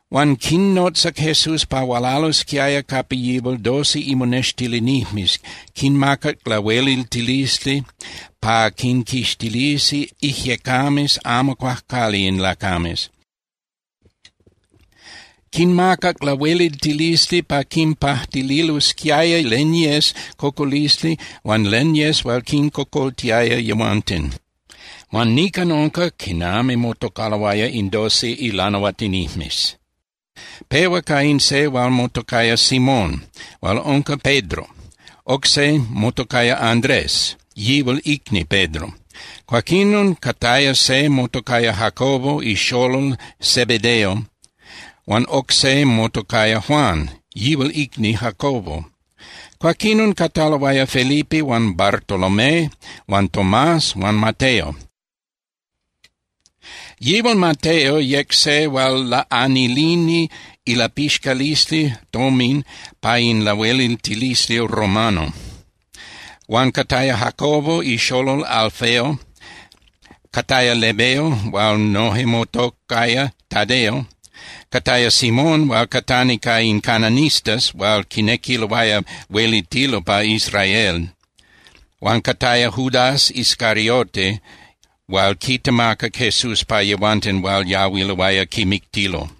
Huan quinnotzac Jesús pa hualalosquiaya capa yihual doce imonextilinijmes, quinmacac lahueliltilisli pa quinquixtilisi ijyecames amo cuajcuali in lacames. Quinmacac lahueliltilisli pa quinpajtililosquiaya len yes cocolisli huan len yes hual quincocoltiaya yehuanten. Huan nican unca quinami motocaloaya in doce ilanahuatinijmes: Pehua ca in se hual motocaya Simón hual unca Pedro, oc se motocaya Andrés, yihual icni Pedro. Cuaquinon cataya se motocaya Jacobo ixolol Zebedeo huan oc se motocaya Juan, yihual icni Jacobo. Cuaquinon cataloaya Felipe huan Bartolomé huan Tomás huan Mateo. Yihual Mateo yec se hual laꞌanilini ilapixcalisli tomin pa in lahueliltilisli romano. Huan cataya Jacobo ixolol Alfeo, cataya Lebeo hual noje motocaya Tadeo, cataya Simón hual catani ca in cananistas hual quinequiloaya huelitilo pa Israel, huan cataya Judas Iscariote hual quitemacac Jesús pa yehuanten hual yahuiloaya quimictilo.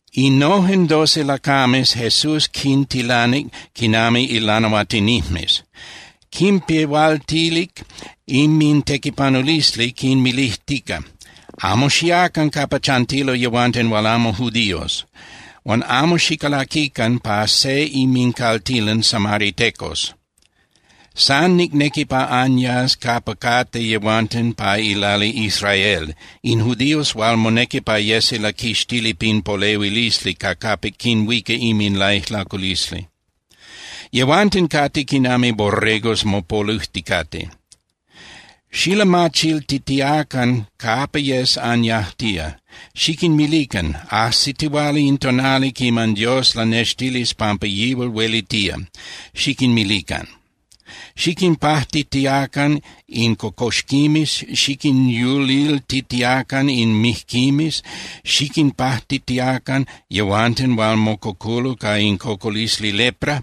Innojen doce lacames Jesús quintilanic quinami ilanahuatinijmes. Quinpehualtilic inmintequipanulisli quinmilijtica: —Amo xiacan capa chantilo yehuanten hual amo judíos. Huan amo xicalaquican pa se inmincaltilan samaritecos. San nicnequi pa anyas capa cate yehuanten pa ilali Israel, in judíos hual monequi pa yesi laquixtili pin polehuilisli ca capic quinhuica inminlaijlaculisli. Yehuanten cate quinami borregos mopolujticate. Xilamachiltitiacan capa yes anyajtía, xiquinmilican: “Ajsitihuala in tonali quiman Dios lanextilis pampa yihual huelitía”, xiquinmilican. Xiquinpajtitiacan in cocoxquimes, xiquinyuliltitiacan in mijquimes, xiquinpajtitiacan yehuanten hual mococulo ca in cocolisli lepra,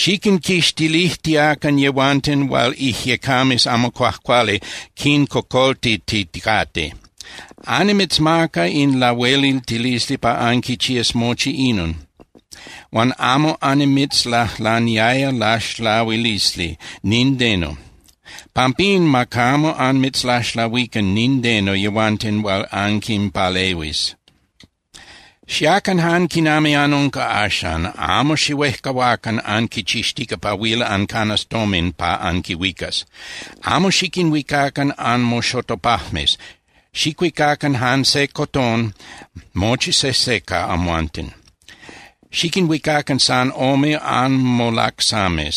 xiquinquixtilijtiacan yehuanten hual ijyecames amo cuajcuali quincocoltiticate. Annimitzmaca in lahueliltilisli pa anquichías mochi inon, huan amo annimitzlajlaniaya laxlahuilisli nindeno. Pampín ma camo anmitzlaxlahuican nindeno yehuanten hual anquinpalehuis. ’Xiacan jan quinami anunca axan, amo xihuejcahuacan anquichixtica pa huil ancanas tomin pa anquihuicas. Amo xiquinhuicacan anmoxotopajmes, xicuicacan jan se cotón mochi sejse ca amhuanten, xiquinhuicacan san ome anmolacsames,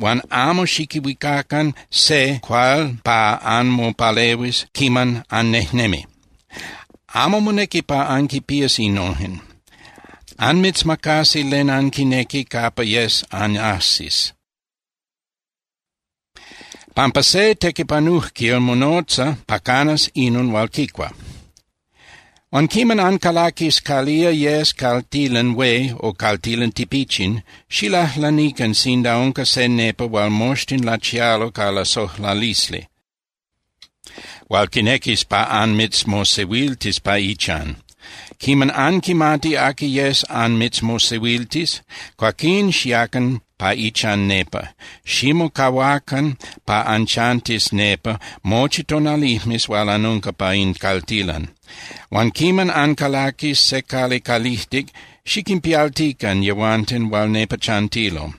huan amo xiquihuicacan se cuál pa anmopalehuis quiman annejnemi. Amo monequi pa anquinpías innojen. Anmitzmacasi len anquinequi capa yes anajsis, pampa se tequipanujquil monotza pa canas inon hual quicua. ’Huan quiman ancalaquis calía yes caltilan hué o caltilan tipichin, xilajlanican sinda unca se nepa hual moxtin lachialo ca lasojlalisli, hual quinequis pa anmitzmosehuiltis pa ichan. Quiman anquimati aqui yes anmitzmosehuiltis, cuaquín xiacan pa ichan nepa. Ximocahuacan pa anchantis nepa mochi tonalijmes hual anunca pa in caltilan. Huan quiman ancalaquis se cali calijtic, xiquinpialtican yehuanten hual nepa chantilo.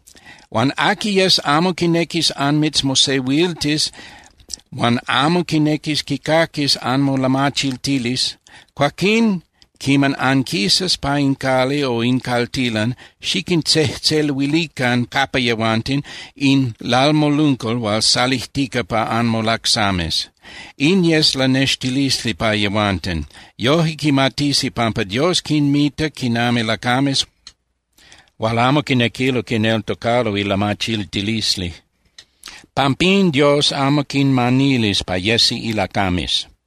Huan aqui yes amo quinequis anmitzmosehuiltis huan amo quinequis quicaquis anmolamachiltilisli, cuaquín quiman anquisas pa in cali o in caltilan, xiquintzejtzeluilican capa yehuanten in lalmoluncal hual salijtica pa anmolacsames. In yes lanextilisli pa yehuanten. Yoje quimatisi pampa Dios quinmita quinami lacames hual amo quinequilo quineltocalo ilamachiltilisli. Pampín Dios amo quinmanilis pa yesi ilacames.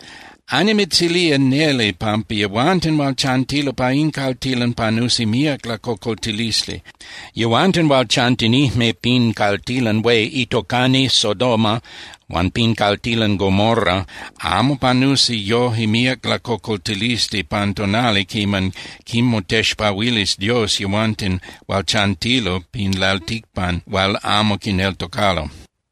Annimitzilía neli pampa yehuanten hual chantilo pa in caltilan panusi míac lacocoltilisli. Yehuanten hual chantinijme pin caltilan hué itocani Sodoma huan pin caltilan Gomorra, amo panusi yoje míac lacocoltilisli pan tonali quiman quinmotexpahuilis Dios yehuanten hual chantilo pin lalticpan hual amo quineltocalo.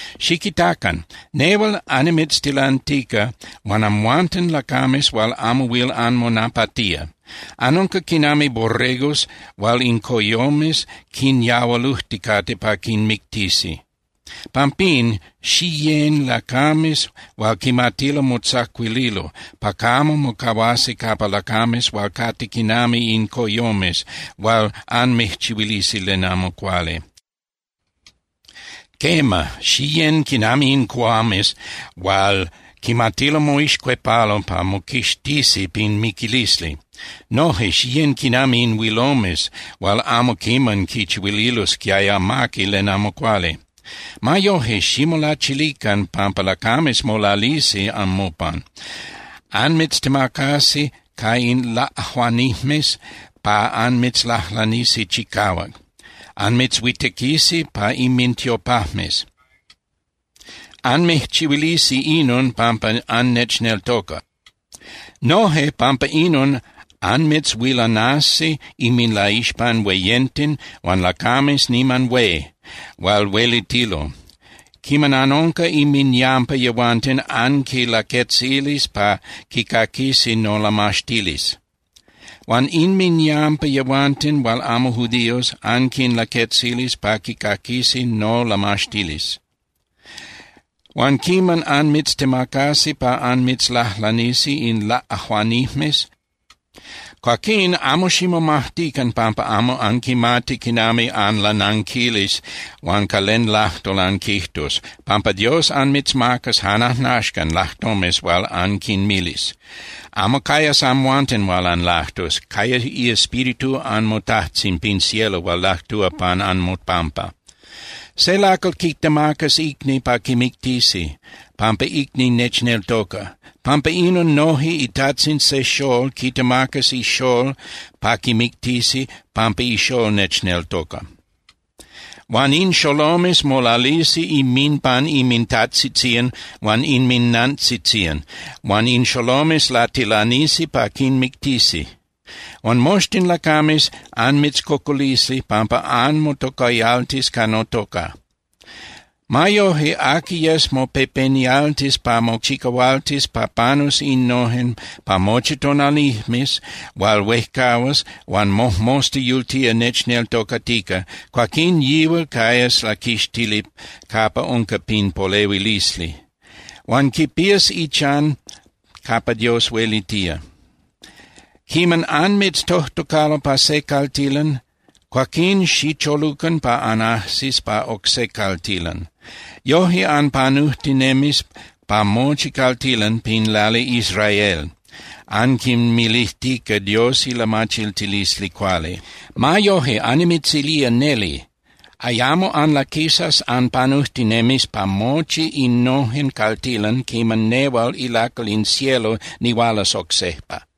’¡Xiquitacan! Nehual annimitztilantica, huan amhuanten lacames hual amo huil anmonapatía. Anunca quinami borregos hual in coyomes quinyahualujticate pa quinmictisi. Pampín, xiyén (xiyecan) lacames hual quimatilo motzacuililo pa camo mocahuasi capa lacames hual cate quinami in coyomes hual anmijchihuilisi len amo cuali. Quema, xiyén quinami in cuhuames hual quimatilo moixcuepalo pa moquixtisi pin miquilisli. Noje xiyén quinami in huilomes hual amo quiman quichihuililosquiaya amaqui len amo cuali. Ma yoje, ximolachilican pampa lacames molalisi anmopan. Anmitztemacasi ca in laꞌajuanijmes pa anmitzlajlanisi chicahuac. Anmitzhuitequisi pa inmintiopajmes. Anmijchihuilisi inon pampa annechneltoca. Noje pampa inon anmitzhuilanasi inminlaixpan hueyenten huan lacames niman hué hual huelitilo. Quiman anunca inminyampa yehuanten anquinlaquetzilis pa quicaquisi nolamaxtilisli. Huan inminyampa yehuanten hual amo judíos anquinlaquetzilis pa quicaquisi nolamaxtilisli. Huan quiman anmitztemacasi pa anmitzlajlanisi in laꞌajuanijmes, cuaquín amo ximomajtican pampa amo anquimati quinami anlananquilis huan ca len lajtol anquijtus, pampa Dios anmitzmacas jan ajnaxcan lajtomes hual anquinmilis. Amo cayas amhuanten hual anlajtus. Cayas iEspíritu anmoTajtzin pin cielo hual lajtúa pan anmopampa. ’Se lacal quitemacas icni pa quimictisi, pampa icni nechneltoca. Pampa inon noje itajtzin se xól quitemacas ixól pa quimictisi pampa ixól nechneltoca. Huan in xolomes molalisi inminpan inmintajtzitzían huan inminantzitzían, huan in xolomes latilanisi pa quinmictisi. Huan moxtin lacames anmitzcocolisi pampa anmotocayaltis ca notoca. Ma yoje, aqui yes mopepenialtis pa mochicahualtis pa panus innojen pa mochi tonalijmes hual huejcahuas huan mojmosta yultía nechneltocatica, cuaquín yihual cayas laquixtili capa unca pin polehuilisli. Huan quipías ichan capa Dios huelitía. Quiman anmitztojtocalo pa se caltilan, cuaquín xicholucan pa anajsis pa oc se caltilan. Yoje anpanujtinemis pa mochi caltilan pin lali Israel, anquinmilijtica Dios ilamachiltilisli cuali. Ma yoje, annimitzilía neli, ayamo anlaquisas anpanujtinemis pa mochi innojen caltilan quiman nehual ilacal in cielo nihualas oc sejpa.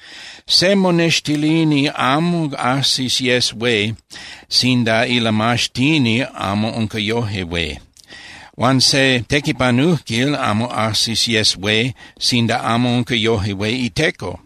’Se monextilini amo ajsis yes hué sinda ilamaxtini amo unca yoje hué. Huan se tequipanujquil amo ajsis yes hué sinda amo unca yoje hué iteco.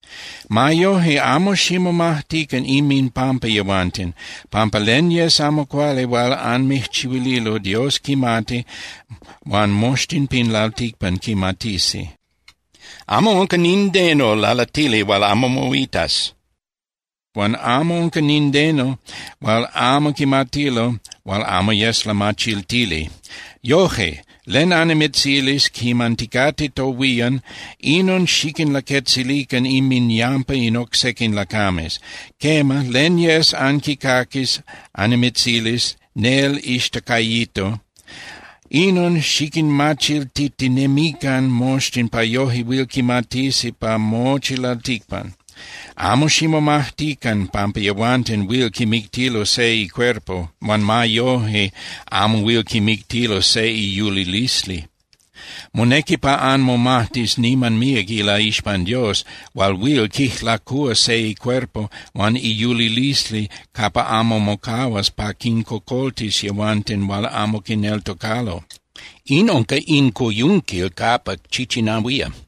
’Ma yoje, amo ximomajtican inminpampa yehuanten, pampa len yes amo cuali hual anmijchihuililo, Dios quimati, huan moxtin pin lalticpan quimatisi. Amo unca nindeno lalatili hual amo moitas, huan amo unca nindeno hual amo quimatilo hual amo yes lamachiltili. Yoje, len annimitzilis quiman ticate tohuían, inon xiquinlaquetzilican inminyampa in oc sequin lacames. Quema, len yes anquicaquis annimitzilis nel ixtacayito, inon xiquinmachiltitinemican moxtin pa yoje huil quimatisi pa mochi lalticpan. Amo ximomajtican pampa yehuanten huil quimictilo se icuerpo huan ma yoje amo huil quimictilo se iyulilisli. Monequi pa anmomajtis niman míac ilaixpan Dios hual huil quijlacúa se icuerpo huan iyulilisli capa amo mocahuas pa quincocoltis yehuanten hual amo quineltocalo. In unca in coyunquil capa chichinahuía.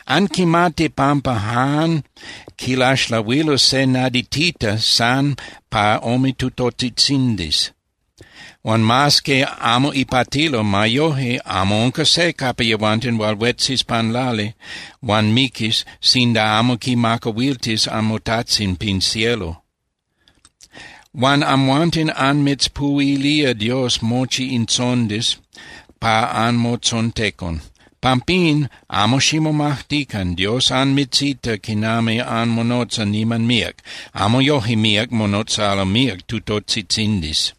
’Anquimati pampa jan quilaxlahuilo se naditita san pa ome tutotzitzindis. Huan mas que amo ipatilo, ma yoje amo unca se capa yehuanten hual huetzis pan lali huan miquis sinda amo quimacahuiltis anmoTajtzin pin cielo. Huan amhuanten anmitzpuhuilía Dios mochi in tzondis pa anmotzontecon. Pampín, amo ximomajtican. Dios anmitzita quinami anmonotza niman míac. Amo yoje míac monotzalo míac tutotzitzindis.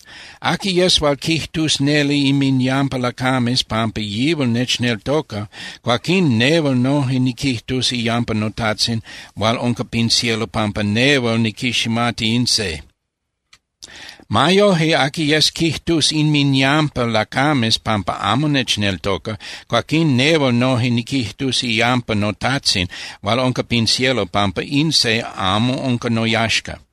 ’Aqui yes hual quijtus neli inminyampa lacames pampa yihual nechneltoca, cuaquín nehual noje niquijtus iyampa noTajtzin hual unca pin cielo pampa nehual niquiximati in se. Ma yoje, aqui yes quijtus inminyampa lacames pampa amo nechneltoca, cuaquín nehual noje niquijtus iyampa noTajtzin hual unca pin cielo pampa in se amo unca noyaxca.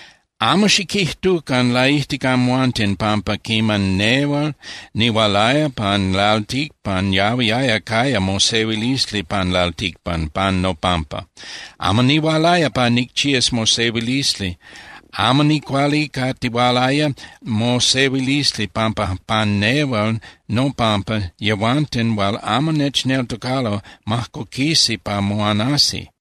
’Amo xiquijtucan laijtic amhuanten pampa quiman nel nihualaya pan lalticpan yahuiaya caya mosehuilisli pan lalticpan pan nopampa. Amo nihualaya pa nicchías mosehuilisli. Amo nicualicatihualaya mosehuilisli, pampa pan nehual nopampa yehuanten hual amo nechneltocalo majcoquisi pa moanasi.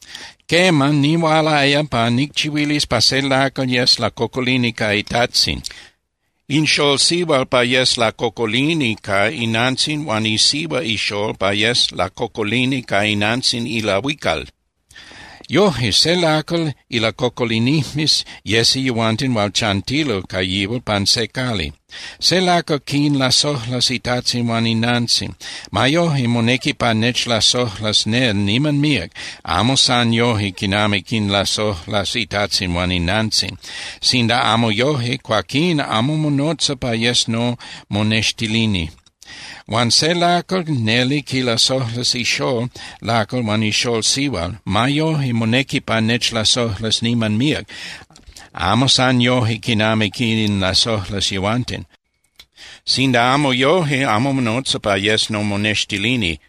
Quema, nihualaya pa nicchihuilis pa se lacal yes lacocolini ca itajtzin, in xól sihual pa yes lacocolini ca inantzin huan isihua ixól pa yes lacocolini ca inantzin ilahuical. Yoje, se lacal ilacocolinijmes yesi yehuanten hual chantilo ca yihual pa se cali. Se lacal quinlasojlas itajtzin huan inantzin. Ma yoje, monequi pa nechlasojlas nel niman míac, amo san yoje quinami quinlasojlas itajtzin huan inantzin. Sinda amo yoje, cuaquín amo monotza pa yes nomonextilini. Huan se lacal neli quilasojlas ixól lacal huan ixól sihual. Ma yoje, monequi pa nechlasojlas niman míac, amo san yoje quinami quinlasojlas yehuanten. Sinda amo yoje, amo monotza pa yes nomonextilini.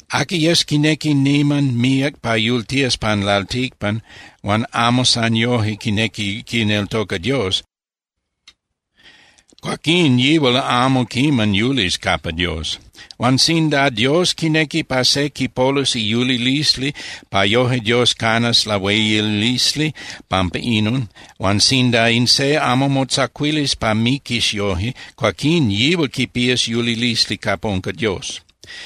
Aqui yes quinequi niman míac pa yultías pan lalticpan huan amo san yoje quinequi quineltoca Dios, cuaquín yihual amo quiman yulis capa Dios. Huan sinda Dios quinequi pa se quipolus iyulilisli pa yoje Dios canas lahueyilisli pampa inon, huan sinda in se amo motzacuilis pa miquis yoje, cuaquín yihual quipías yulilisli capa unca Dios.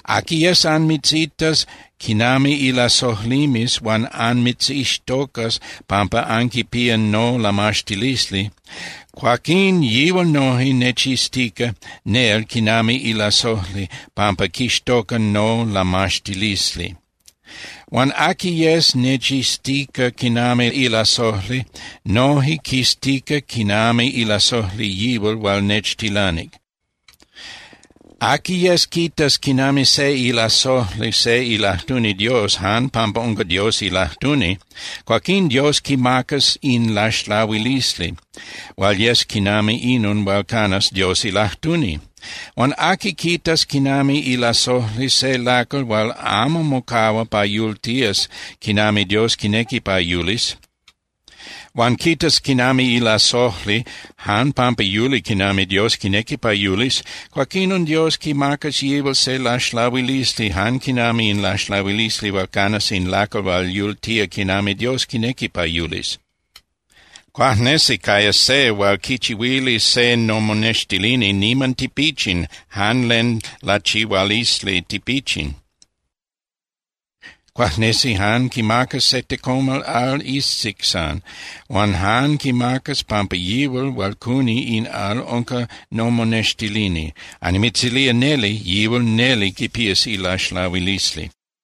’Aqui yes anmitzitas quinami ilasojlimes huan anmitzixtocas pampa anquipía nolamaxtilisli, cuaquín yihual noje nechiztica nel quinami ilasojli pampa quixtoca nolamaxtilisli. Huan aqui yes nechiztica quinami ilasojli noje quiztica quinami ilasojli yihual hual nechtilanic. Aqui yes quitas quinami se ilasojli se ilajtuni Dios jan pampa unca Dios ilajtuni, cuaquín Dios quimacas in laxlahuilisli hual yes quinami inon hual canas Dios ilajtuni. Huan aqui quitas quinami ilasojli se lacal hual amo mocahua pa yultías quinami Dios quinequi pa yulis, huan quitas quinami ilasojli jan pampa yuli quinami Dios quinequi pa yulis, cuaquinon Dios quimacas yihual se laxlahuilisli jan quinami in laxlahuilisli hual canas in lacal hual yultía quinami Dios quinequi pa yulis. Cuajnesi cayas se hual quichihuilis se nomonextilini niman tipichin jan len lachihualisli tipichin. Cuajnesi jan quimacas se tecomal al iztic san, huan jan quimacas pampa yihual hual cuni in al unca nomonextilini. Annimitzilía neli, yihual neli quipías ilaxlahuilisli.